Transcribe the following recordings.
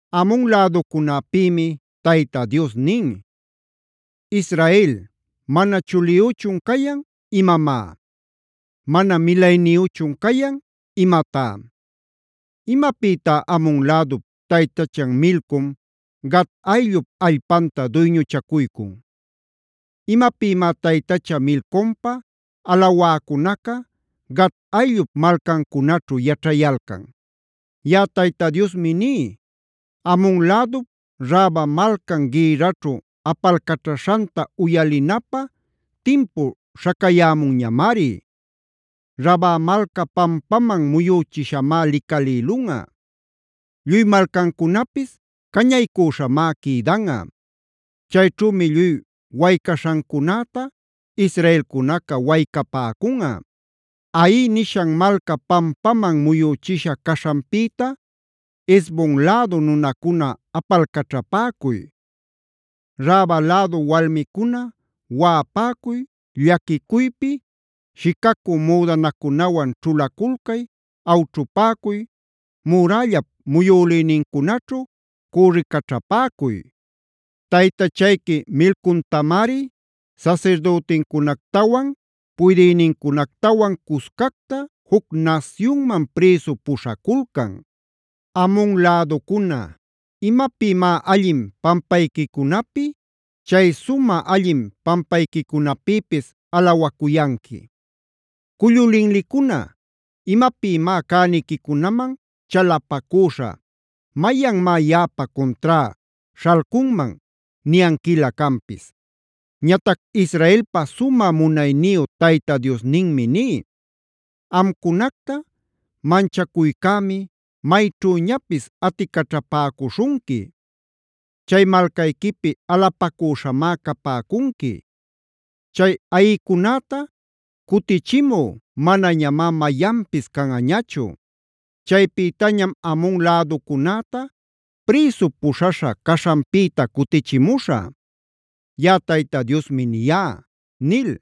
Amona läducunäpïmi Tayta Dios nin: “¿Israel, mana chuliyüchun cayan imamá? ¿Mana milayniyüchun cayan imatá? ¿Imapïtá Amon lädup taytachan Milcom, Gad ayllup allpanta duyñuchacuycun? ¿Imapïmá taytacha Milcomta alawäcunaca, Gad ayllup malcancunaćhu yaćhayalcan? Yaꞌa Tayta Diosmi ní: Amon lädup Raba malcan gïrraćhu apalcaćhaśhanta uyalinapä timpu śhacayämunñamari. Raba malca pampaman muyüchishamá licalïlunꞌa; lluy malcancunapis cañaycüśhamá quïdanꞌa. Chayćhümi lluy waycaśhancunäta israelcunaca waycapäcunꞌa. “Hai nishan malca pampaman muyüchisha caśhanpïta Hesbon lädu nunacuna apalcaćhapäcuy. Raba lädu walmicuna, waꞌapäcuy, llaquicuypi shicacü müdanacunawan ćhulaculcay, awćhupäcuy, murällap muyülïnincunaćhu cürricaćhapäcuy. Taytachayqui Milcomtamari sasirdütincunactawan, puydïnincunactawan cuscacta juc nasyunman prïsu puśhaculcan. Amon läducuna, ¿imapïmá allin pampayquicunapi, chay sumä allin pampayquicunapïpis alawacuyanqui? Cullu linlicuna, ¿imapïmá cäniquicunaman chalapacüśha: ‘Mayanmá yaꞌapa cuntrá śhalcunman’ niyanquilä canpis? Ñatac Israelpa sumä munayniyu Tayta Diosninmi ní: Amcunacta manchacuycämi mayćhüñapis aticaćhapäcuśhunqui. Chay malcayquipi alapacüśhamá capäcunqui. Chay ayïcunäta cutichimü manañamá mayanpis canꞌañachu. Chaypïtañam Amon läducunäta prïsu puśhaśha caśhanpïta cutichimuśhä. Yaꞌa Tayta Diosmi niyá” nil.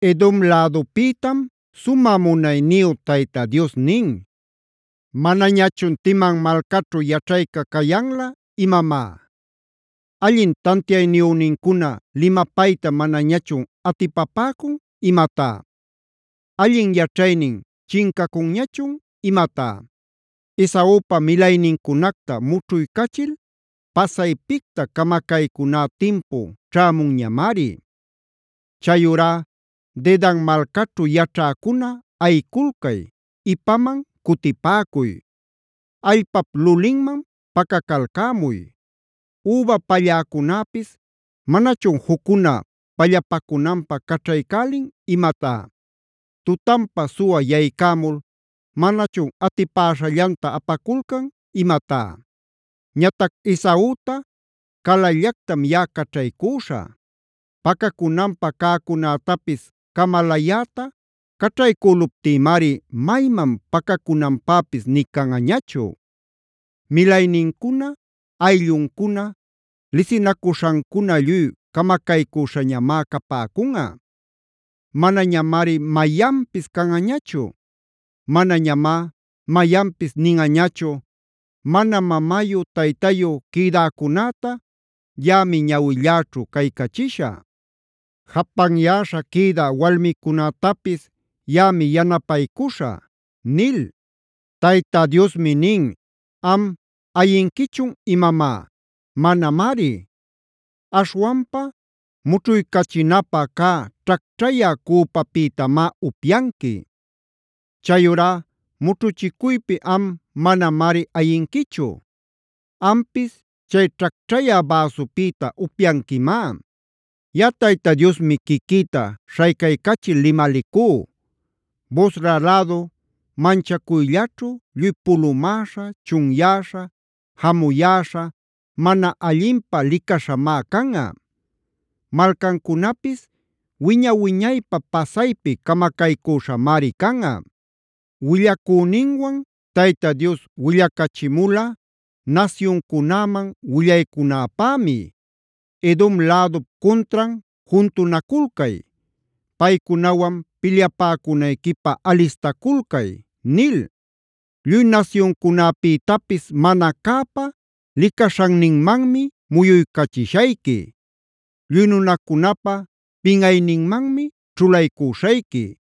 Edomb lädupïtam sumä munayniyu Tayta Dios nin: “¿Manañachun Teman malcaćhu yaćhayca cayanlä imamá? ¿Allin tantiayniyünincuna limapayta manañachun atipapäcun imatá? ¿Allin yaćhaynin chincacunñachun imatá? Esaupa milaynincunacta mućhuycachil pasaypicta camacaycuná timpu ćhämunñamari. Chayurá Dedan malcaćhu yaćhäcuna ayiculcay, ipaman cutipäcuy; allpap lulinman pacacalcämuy. Üba palläcunäpis, ¿manachun juccuna pallapacunanpä caćhaycälin imatá? Tutanpa suwa yaycämul ¿manachun atipäśhallanta apaculcan imatá? Ñatac Esauta calallactam yaꞌa caćhaycüśhä. Pacacunanpä cäcunätapis camalayäta caćhaycüluptïmari mayman pacacunanpäpis nï canꞌañachu. Milaynincuna, aylluncuna, lisinacuśhancuna lluy camacaycüśhañamá capäcunꞌa; manañamari mayanpis canꞌañachu. Manañamá mayanpis ninꞌañachu: ‘Mana mamayu-taytayu quïdäcunäta yaꞌami ñawilläćhu caycachishä. Japanyäśha quïda walmicunätapis yaꞌami yanapaycuśhä’” nil. Tayta Diosmi nin: “¿Am, ayinquichun imamá? Manamari. Aśhwanpa mućhuycachinäpä cä ćhacćhayä cüpapïtamá upyanqui. Chayurá mućhuchicuypi am manamari ayinquichu; ampis chay ćhacćhayä bäsupïta upyanquimá. Yaꞌa Tayta Diosmi quiquïta śhaycaycachil limalicú: Bosra lädu manchacuyllaćhu, lluy pulumäśha, chunyäśha, jamuyäśha, mana allinpä licaśhamá canꞌa. Malcancunapis wiña-wiñaypä pasaypi camacaycüśhamari canꞌa. “Willacüninwan Tayta Dios willacachimula, nasyuncunäman willaycunäpämi: ‘Edom lädup cuntran juntunaculcay. Paycunawan pilyapäcunayquipä alistaculcay’ nil. “Lluy nasyuncunapïtapis mana cäpa licaśhanninmanmi muyuycachishayqui. Lluy nunacunapa pinꞌayninmanmi ćhulaycüśhayqui.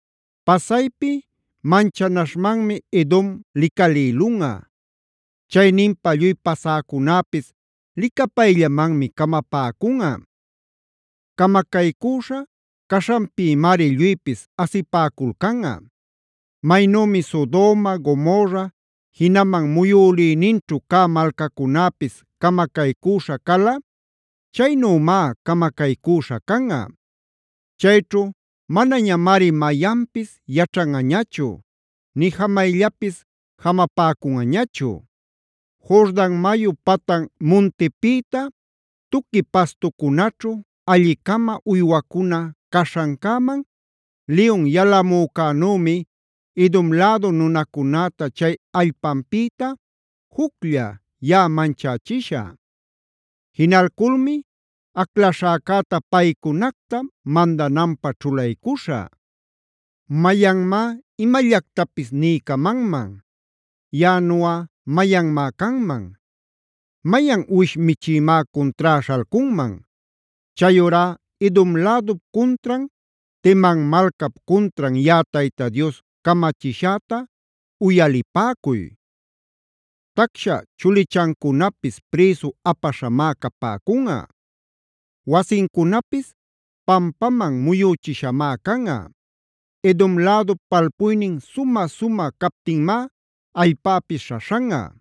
“Pasaypi manchanaśhmanmi Edom licalïlunꞌa. Chayninpa lluy pasäcunäpis licapayllamanmi camapäcunꞌa; camacaycüśha caśhanpïmari lluypis asipäculcanꞌa. Maynümi Sodoma, Gomorra, jinaman muyülïninćhu cä malcacunäpis camacaycüśha cala, chaynümá camacaycüśha canꞌa.c Chayćhu manañamari mayanpis yaćhanꞌañachu, nï jamayllapis jamapäcunꞌañachu. “Jordan mayu patan muntipïta tuqui pastucunaćhu, alli-cama uywacuna caśhancäman liyun yalamücänümi, Edom lädu nunacunäta chay allpanpïta, juclla yaꞌa manchächishä. Jinalculmi aclaśhäcäta paycunacta mandananpä ćhulaycuśhä. ¿Mayanmá imallactapis niycamanman? Yaꞌanuꞌa ¿mayanmá canman? ¿Mayan uwish michïmá cuntrá śhalcunman? “Chayurá Edom lädup cuntran, Teman malcap cuntran yaꞌa Tayta Dios camachishäta uyalipäcuy. Tacsha chulichancunapis prïsu apaśhamá capäcunꞌa; wasincunapis pampaman muyüchishamá canꞌa. Edom lädup palpuynin sumä-sumä captinmá allpäpis śhaśhanꞌa.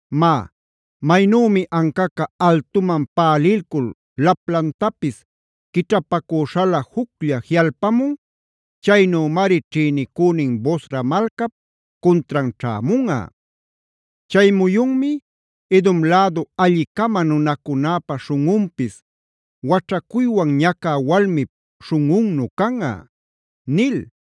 Má, maynümi ancaca altuman pälilcul laplantapis quićhapacüśhalä juclla jiꞌalpamun, chaynümari ćhïnicünin Bosra malcap cuntran ćhämunꞌa. Chay muyunmi Edom lädu alli-cama nunacunäpa śhunꞌunpis waćhacuywan ñacä walmip śhunꞌunnu canꞌa” nil.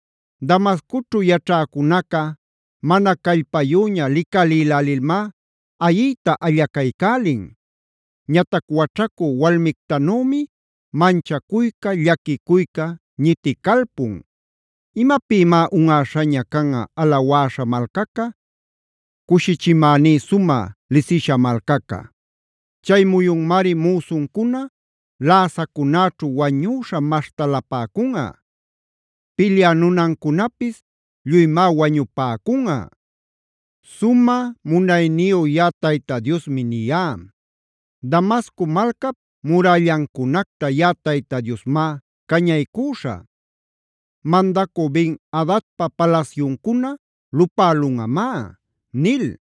Damascoćhu yaćhäcunaca mana callpayüña licalïlälilmá ayiyta allaycälin. Ñatac waćhacü walmictanümi manchacuyca, llaquicuyca ñiticalpun. ¿Imapïmá unꞌäśhaña canꞌa alawäśha malcaca, cushichimäní sumä lisisha malcaca? Chay muyunmari müsuncuna läsacunäćhu wañüśha maśhtalapäcunꞌa; pilyä nunancunapis lluymá wañupäcunꞌa. Sumä munayniyu yaꞌa Tayta Diosmi niyá. Damasco malcap murällancunacta yaꞌa Tayta Diosmá cañaycüśhä; mandacü Ben-adadpa palasyuncuna lupälunꞌamá” nil.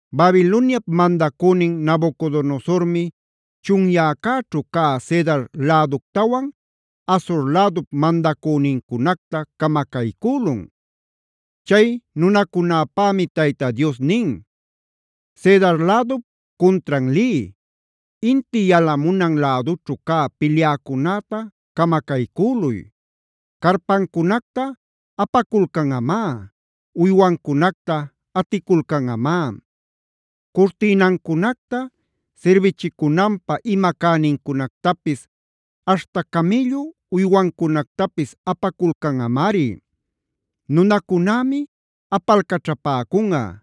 Babiloniap mandacünin Nabucodonosormi chunyäcäćhu cä Cedar läductawan Hazor lädup mandacünincunacta camacaycülun. Chay nunacunäpämi Tayta Dios nin: “Cedar lädup cuntran liy, inti yalamunan lädućhu cä pilyäcunäta camacaycüluy. Carpancunacta apaculcanꞌamá; uywancunacta aticulcanꞌamá. Curtïnancunacta, sirbichicunanpä ima cänincunactapis, aśhta camïllu uywancunactapis apaculcanꞌamari. Nunacunämi apalcaćhapäcunꞌa: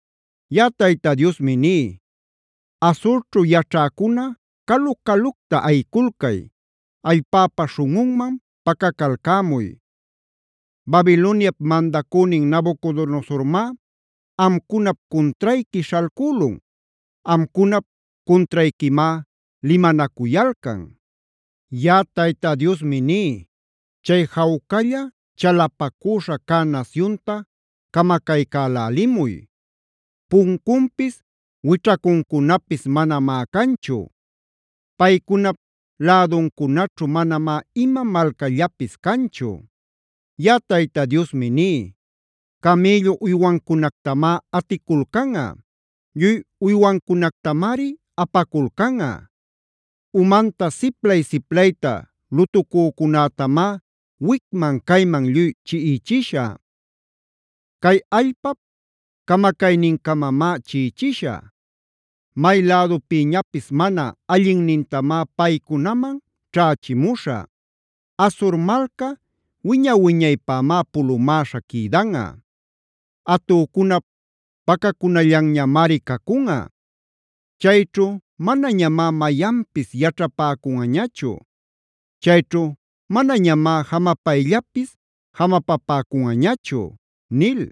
Yaꞌa Tayta Diosmi ní: Hazorćhu yaćhäcuna, calu-calucta ayiculcay, allpäpa śhunꞌunman pacacalcämuy. Babiloniap mandacünin Nabucodonosormá amcunap cuntrayqui śhalcülun, amcunap cuntrayquimá limanacuyalcan. “Yaꞌa Tayta Diosmi ní: Chay jawcalla, chalapacüśha cä nasyunta camacaycälälimuy. Puncunpis, wićhacuncunapis manamá canchu. Paycunap läduncunaćhu manamá ima malcallapis canchu. Yaꞌa Tayta Diosmi ní: Camïllu uywancunactamá aticulcanꞌa; lluy uywancunactamari apaculcanꞌa. Umanta siplay-siplayta lutucücunätamá wicman-cayman lluy chiꞌichishä. Cay allpap camacaynincamamá chiꞌichishä. May lädupïñapis mana allinnintamá paycunaman ćhächimuśhä. Hazor malca wiña-wiñaypämá pulumäśha quïdanꞌa; atücunap pacacunallanñamari cacunꞌa. Chayćhu manañamá mayanpis yaćhapäcunꞌañachu; chayćhu manañamá jamapayllapis jamapäcunꞌañachu” nil.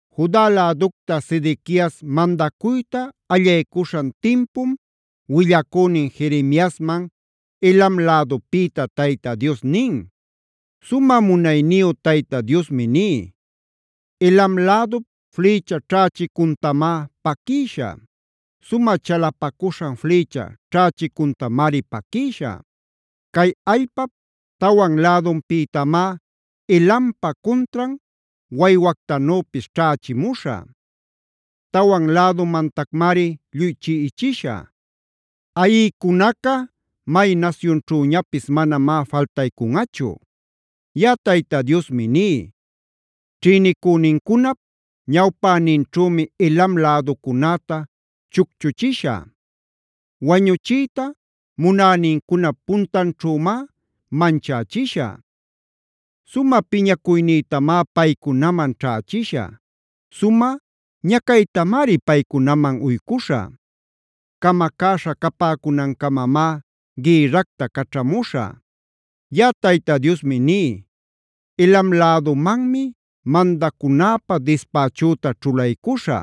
Juda läducta Sedequias mandacuyta allaycuśhan timpum willacünin Jeremiasman Elam lädupïta Tayta Dios nin: “Sumä munayniyu Tayta Diosmi ní: “Elam lädup flïcha ćhächicuntamá paquïshä. Sumä chalapacuśhan flïcha ćhächicuntamari paquïshä. Cay allpap tawan lädupïtamá Elampa cuntran waywactanüpis ćhächimuśhä. Tawan lädumantacmari lluy chiꞌichishä. Ayïcunaca may nasyunćhüñapis manamá faltaycunꞌachu. Yaꞌa Tayta Diosmi ní: Ćhïnicünincunap ñawpäninćhümi Elam läducunäta chucchuchishä. Wañuchiyta munänincunap puntanćhümá manchächishä. Sumä piñacuynïtamá paycunaman ćhächishä; sumä ñacaytamari paycunaman uycuśhä. Camacäśha capäcunancamamá gïrracta caćhamuśhä. Yaꞌa Tayta Diosmi ní: Elam lädumanmi mandacunäpä dispächüta ćhulaycuśhä.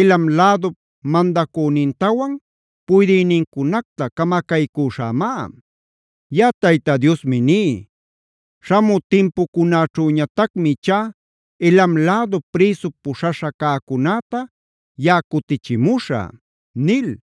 Elam lädup mandacünintawan puydïnincunacta camacaycüśhämá. Yaꞌa Tayta Diosmi ní: Śhamü timpucunäćhüñatacmi ichá Elam lädu prïsu puśhaśha cäcunäta yaꞌa cutichimuśhä” nil.